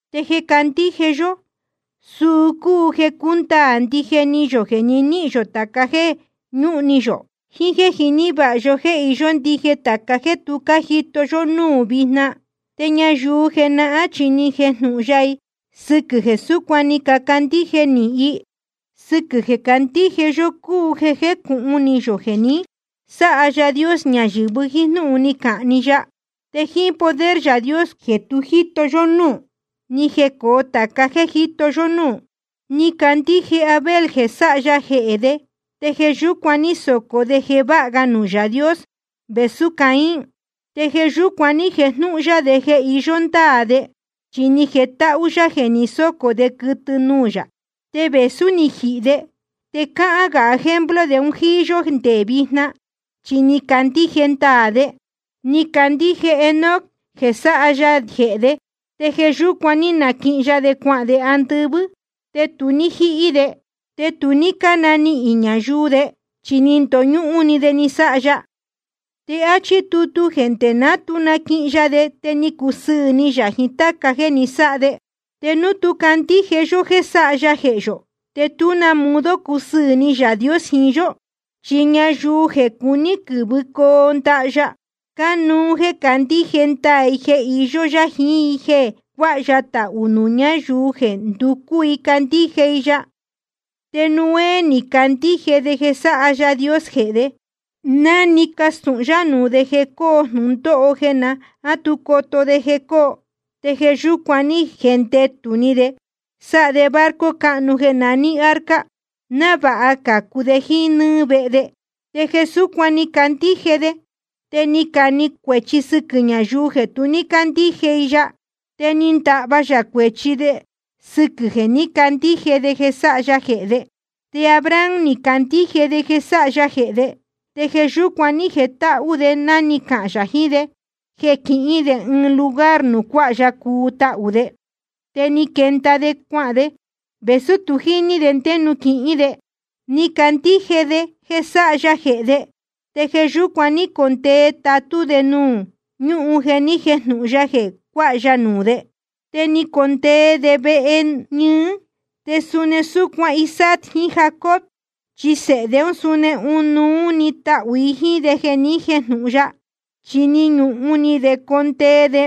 Te jeē candíje yó, suu cúu jeē cúndaā ndije ni yō jeē nihín yō tāca jéē ñúhun ni yō, jiín jéē jiní vāha yó jéē iyó ndije tāca jéē tu cájito yó núū vijna. Te ñayuu jenahán chi ni jejnúhún yá i sɨquɨ̄ jeē súcuan ni cacandíje nīhin i. Sɨquɨ̄ jeē candíje yó cúu jeē jécūhun ni yō jeē ni sáha Yaā Dios ñayɨ̄vɨ jíín jnúhun ni cahān‑ni ya. Te jíín poder Yaā Dios jeē tu jíto yó núū, ni jecōo tāca jéē jíto yó núū. Ni candíje Abel jeē sáha ya jehē de, te jeē yúcuan ní socō de jeē váha ga nuū Yaā Dios vēsú Caín. Te jeē yúcuan ní jejnúhún yá jeē iyó ndáā de, chi ni jetáhú yá jeē ni sócō de quɨtɨ nuū yā. Te vēsú ni jihī de, te cáhán gā ejemplo de jíín yó nde vijna, chi ni candíje ndaā de. Ni candíje Enoc jeē sáha ya jehē de, te jeē yúcuan ní naquihin ya de cuahān de andɨvɨ́, te tu ní jíhí de. Te tu ní cánanihīn ñayuu de, chi ni ndoñúhún‑ni de ni sáha ya. Te áchí tutu jeē nde ná tu naquihin ya de te ni cusɨɨ̄ ni yā jiín táca jéē ni sáha de. Te núu tu cándíje yó jéē sáha ya jehē yō, te tú na modo cusɨɨ̄ ni Yaā Dios jiín yó. Chi ñayuu jeē cuní quɨ̄vɨcoo ndaha ya, cánuú jéē candíje ndaā i jeē iyó yá jiín jéē cuáha ya tahū nuū ñáyuu jeē nducú i candíje i ya. Te Noé ni candíje de jeē sáha Yaā Dios jehē de, ná ni castūhun yá nuū de jeē coo jnūndóho jeē ná tu coto de jeē coo. Te jeē yúcuan ní jendetū de ni sáha de barco cáhnu jeē naní arca, návāha cācu de jíín nɨ́ɨ́ vehe de. Te jeē súcuan ni candíje de, te ni cane cuēchi sɨquɨ̄ ñayuu jeē tu ní cándíje i ya. Te ni ndahva yā cuēchi de sɨquɨ̄ jeē ní candíje de jeē sáha ya jehē de. Te Abraham ni candíje de jeē sáha ya jehē de, te jeē yúcuan ní jetáhú de ná ni cahān yā jiín de jeē quihín de ɨɨn lugar nuū cuáha ya cuu tahū de. Te ni quenda de cuahān de, vēsú tu jíní de ndé nuū quihín de. Ni candíje de jeē sáha ya jehē de, te jeē yúcuan ní condee tatú de nuū ñúhun jeē ni jéjnūhun ya jeē cuáha ya nuū de. Te ni condee de vehe ñɨɨ, te suni súcuan Isaac jiín Jacob, chi sēhe de ún suni ɨnuú níhīn tahū i jíín de jeē ni jéjnūhun ya. Chi ni ñuhun ni de condee de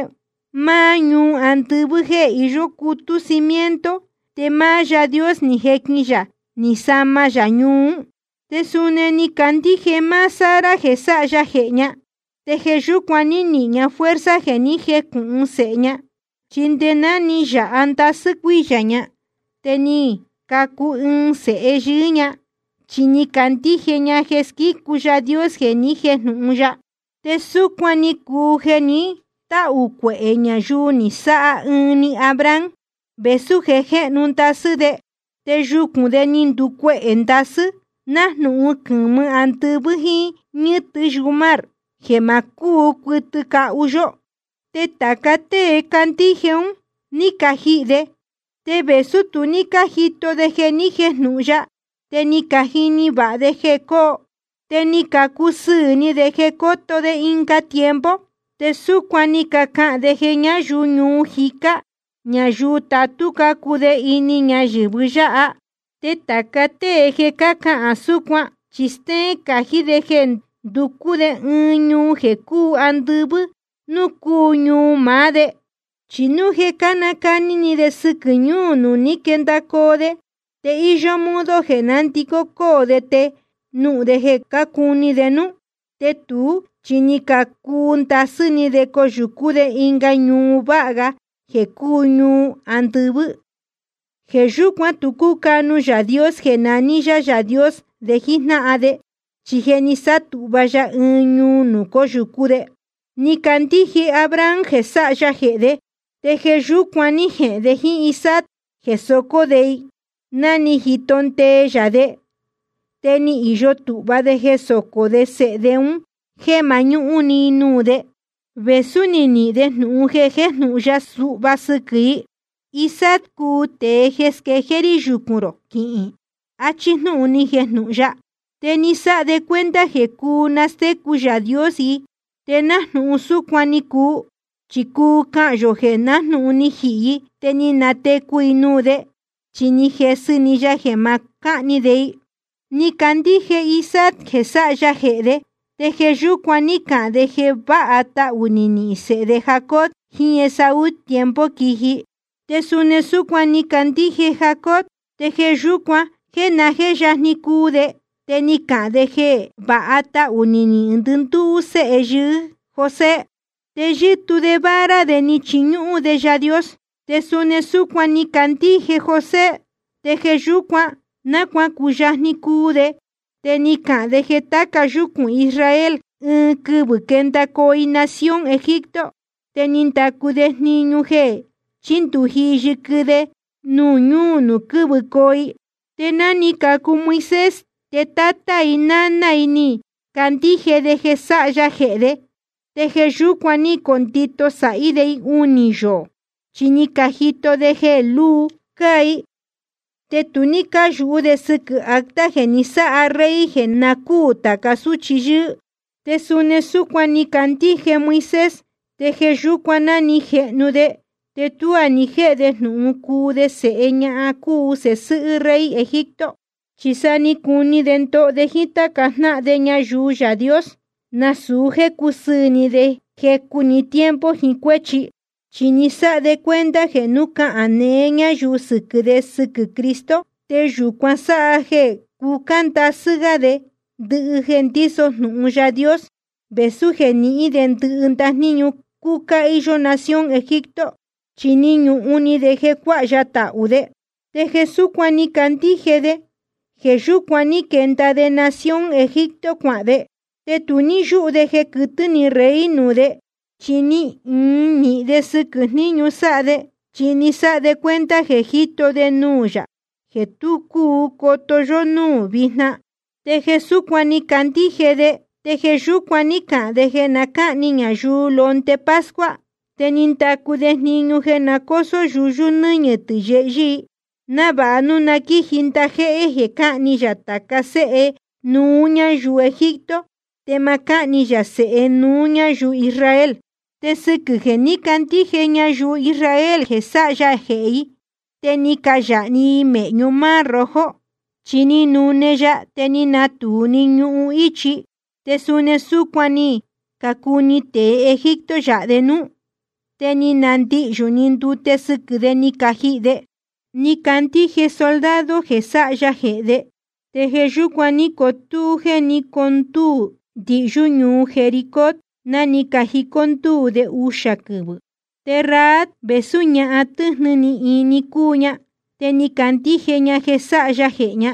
máá ñuu andɨvɨ́ jéē iyó cutú cimiento, te máá Yaā Dios ni jequin yā ni sama ya ñuu ún. Te suni ni candíje máá Sara jeē sáha ya jehē ña, te jeē yúcuan ní nihīn ña fuerza jeē ní jecūhun sēhe ña. Chi nde ná ni yāha ndasɨ́ cuíyā ña, te ni cacu ɨɨn sēhe yɨɨ́ ña, chi ni candíje ña jeē squícu Yaā Dios jeē ni jéjnūhun ya. Te súcuan ni cuu jeē ni táhū cuehē ñayuu ni sáha ɨɨn‑ni Abraham, vēsú je jéhnu ndasɨ́ de. Te yucūn de ni nducuehē ndasɨ́, nájnūhun quɨ̄mɨ andɨvɨ́, jíín ñɨ́tɨ yumar, jeē ma cúu cuɨtɨ cahu yó. Te tāca tée cándíje un, ní cajihī de. Te vēsú tu ní cájito de jeē ni jéjnūhun ya, te ni cajini vāha de jeē cóo, te ni cacusɨɨ̄ ni de jeē cóto de ɨnga tiempo. Te súcuan ni cacahān de jeē ñáyuu ñuu jicá ñáyuu tatú cácuu de ini ñayɨ̄vɨ yáha. Te tāca tée jeē cahán súcuan, chi stéén cají de jeē nducú de ɨɨn ñuu jeē cúu andɨvɨ́ núū cúu ñuu maá de. Chi núu jeē cánacani ni de sɨquɨ̄ ñúū nuū ní quendacoo de, te íyó modo jeē nándicó cóo de te núu jeē cácuni de núú. Te tuú chi ni cacuu ndasɨ́ ni de coyūcú de ɨnga ñuu váha ga jeē cúu ñuu andɨvɨ́. Jeē yúcuan tu cúcanu Yaā Dios jeē naní yá Yaā Dios de jíjnáhan de, chi je ni sátūhva ya ɨɨn ñuu nuū cóyūcú de. Ni candíje Abraham jeē sáha ya jehē de, te jeē yúcuan ní jehēn de jíín Isaac jeē socó de i, ná ni jito ndee ya de. Te ni īyo tūhva de jeē socó de sēhe de un jéē mañúhún ni i nuū de, vēsú ni nihīn de jnūhun jeē ni jéjnūhun ya suhva sɨquɨ̄ i: Isaac cúu tēe jeē squejéé rí yucūn rō quihīn, achí jnúhun ni jejnūhun ya. Te ni sáha de cuenta jeē cúu nastécu Yaā Dios i. Te nájnūhun súcuan ni cuu, chi cuu cahān yō jeē nájnūhun ni jihī i te ni natecu i nuū de, chi ni jesɨ‑ni ya jeē ma cáhni de i. Ni candíje Isaac jeē sáha ya jehē de, te jeē yúcuan ní cahān de jeē vāha tahū nihīn sēhe de Jacob jiín Esaú tiempo quiji. Te suni súcuan ni candíje Jacob, te jeē yúcuan, náa je yajni cuu de te ni cahān de jeē vāha tahū nihīn ndɨndúú séhe yɨɨ́ José. Te yɨ́tuu de vara de, ni chiñúhún de Yaā Dios. Te suni súcuan ni candíje José, te jeē yúcuan, náa cuacuyajni cuu de, te ni cahān de jeē tāca yúcūn Israel, ɨɨn quɨvɨ̄ quendacoo i nación Egipto. Te ni ndacu de jniñu jeē chíndūji i yɨquɨ de ñuu nuū quɨ́vɨcoo i. Te ná ni cacu Moisés, te tátá i náná i ni cacandíje de jeē sáha ya jehē de, te jeē yúcuan ní cacondito sāhí de i unī yoō. Chi ni cajito de jeē lúu cáa i, te tu ní cáyūhú de sɨquɨ̄ acta jeē ni sáha rey jeē na cúū tāca súchi yɨ́ɨ́. Te suni súcuan ni candíje Moisés, te jeē yúcuan ná ni jehnu de te tuá ni jéhe de jnūhun cuu de sēhe ñahan cúu sēhe sɨ́hɨ́ rey Egipto. Chi sa ni cuu ni de ndoho de jíín táca jnáhan de ñayuu Yaā Dios, nasūu jéē cusɨɨ̄ ni de jecu‑ni tiempo jiín cuéchi. Chi ni sáha de cuenta jeē núu cahān neé ñayuu sɨquɨ̄ de jeē sɨquɨ́ Cristo, te yūcuan sáha jeē cucá ndasɨ́ gá de ndɨhɨ jeē ndíso jnūhun Yaā Dios, vēsú jeē nihín de ndɨhɨ ndajníñu cúcá íyó nación Egipto. Chi ni ñuhun ni de jeē cuáha ya tahū de. Te jeē súcuan ni candíje de, jeē yúcuan ní quenda de nación Egipto cuahān de. Te tu ní yúhú de jeē quɨtɨ́ ni rey nuū de. Chi ni īin nīhin de sɨquɨ̄ jniñu sáha de, chi ni sáha de cuenta jeē je jíto de nuū Yaā jeē tu cúu coto yó núū vijna. Te jeē súcuan ni candíje de, te jeē yúcuan ní cahān de jeē na cáhni ñayuu londe pascua. Te ni ndacu de jniñu jeē na cósó yuyú i nɨñɨ̄ tɨ̄ yehyɨ́ i, návāha núu na quíji ndajéhé jeē cáhni yā tāca séhe nuú ñáyuu Egipto, te ma cáhni yā sēhe nuú ñáyuu Israel. Te sɨquɨ̄ jeē ní cacandíje ñayuu Israel jeē sáha ya jehē i, te ni cayāha‑ni i mēhñu Mar Rojo, chi ni nune ya te ni natūu‑ni ñuhun íchi. Te suni súcuan ni cacuni tēe Egipto yāha de núú, te ni nandihyū‑ni ndute sɨquɨ̄ de ni cajihī de. Ni cacandíje soldado jeē sáha ya jehē de, te jeē yúcuan ní cotúú jeē ní condúū ndihyú ñuu Jericó, ná ni cajicó ndúū de uxā quɨvɨ̄. Te Rahab, vēsú ñahan tɨ́jnɨ ni ni cuu ña, te ni candíje ña jeē sáha ya jehē ña.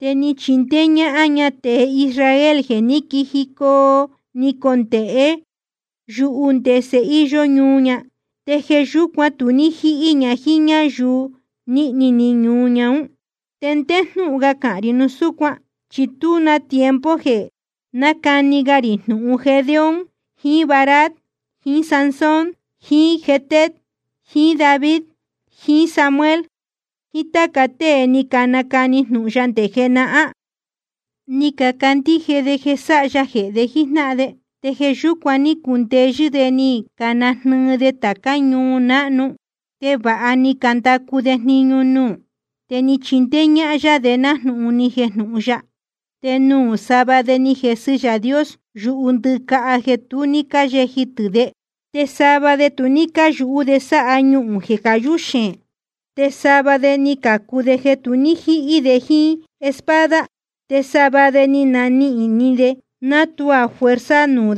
Te ni chindéé ñáhán ña tēe Israel jeē ní quijicoo ni condēhé yuhu ndese íyó ñuu ña. Te jeē yúcuan tu ní jíhí ña jíín ñáyuu nīhni ni ñuu ña ún. ¿Te ndé jnúhun ga cahān rī núu súcuan? Chi tuá na tiempo jeē nácani ga rī jnūhun Gedeón jiín Barac jiín Sansón jiín Jefté jiín David jiín Samuel jiín táca tée ni canacani jnūhun ya nde jenahán. Ni cacandíje de jeē sáha ya jehē de jíjnáhan de, te jeē yúcuan ní cacundeyɨ́ de ni canajnɨɨ de tācá ñuu náhnu, te vāha ni candacu de jniñu nuū, te ni chindéé ñáhán yá de nájnūhun ni jejnūhun ya. Te nuū sava de ni jesɨ Yaā Dios yuhu ndɨ́caha jeē tu ní cáyeji tɨ̄ de. Te sava de tu ní cáyú de sáha ñuhūn jeē cayú xeēn. Te sava de ni cācu de jeē tu ní jíhí de jíín espada. Te sava de ni nanihīn ni de náa tuá fuerza de núú,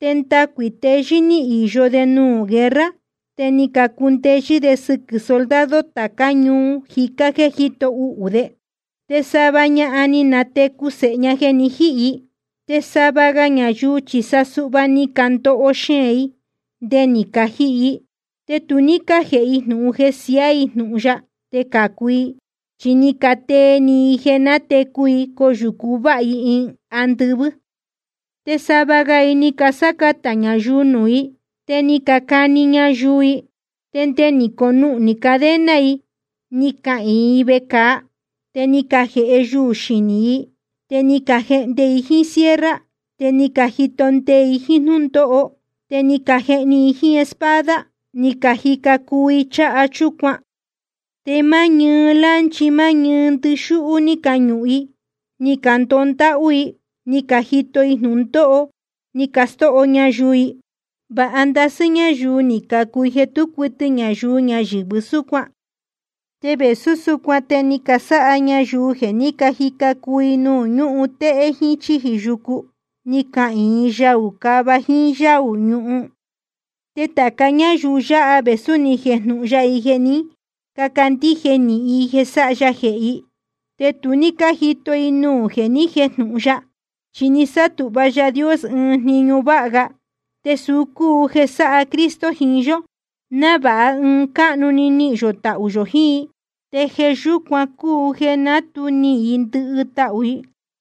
te ndacuī teyɨ́ ní īyo de nuū guerra, te ni cacundeyɨ́ de sɨquɨ̄ soldado tācá ñuu jicá jéē jíto uhū ún de. Te sava ñahan ni natecu sēhe ña jeē ni jíhī i. Te sava ga ñayuu chi sa suhva ni candoho xeēn i nde ni cajihī i. Te tu ní cájēhe i jnūhun jeē siaá i jnūhun ya te cācu i, chi ni catee ni i jeē natecu i coyūcu váha ga i andɨvɨ́. Te sava ga i ni casácatā ñayuu nuū i, te ni cacani ñayuu i, te nde ni caconuhnī cadena i ni cahīin i vecāa. Te ni cajēhe yuū xinī i, te ni cajehnde i jíín sierra, te ni cajito ndee i jíín jnúndóho, te ni cajehni i jíín espada. Ni cajica cuu i cháha chúcuan, te máá ñɨɨ lánchi máá ñɨɨ ndíxúhú ní cañuhun i. Ni candoho ndáhú i, ni cajito i jnūndóho, ni castóho ñayuu i. Vāha ndasɨ́ ñáyuu ni cacuu i jeē tú cuɨtɨ ñayuu ñayɨ̄vɨ súcuan, te vēsú súcuan te ni casáha ñayuu jeē ní cajica cuu i nuū ñúhun téhé jíín chíji yucu, ni cahīin i yaū cava jíín yáū ñuhun. Te tāca ñáyuu yáha, vēsú ni jejnúhún yá i jeē ní cacandíje nīhin i jeē sáha ya jehē i, te tu ní cájito i nuū jeē ni jéjnūhun ya. Chi ni sátūhva Yaā Dios ɨɨn jniñu váha ga, te suu cúu jeē sáha Cristo jiín yó, návāha ɨɨn cáhnu‑ni nihīn yō tahū yō jiín i, te jeē yúcuan cúu jeē ná tu nihīn i ndɨhɨ tahū i.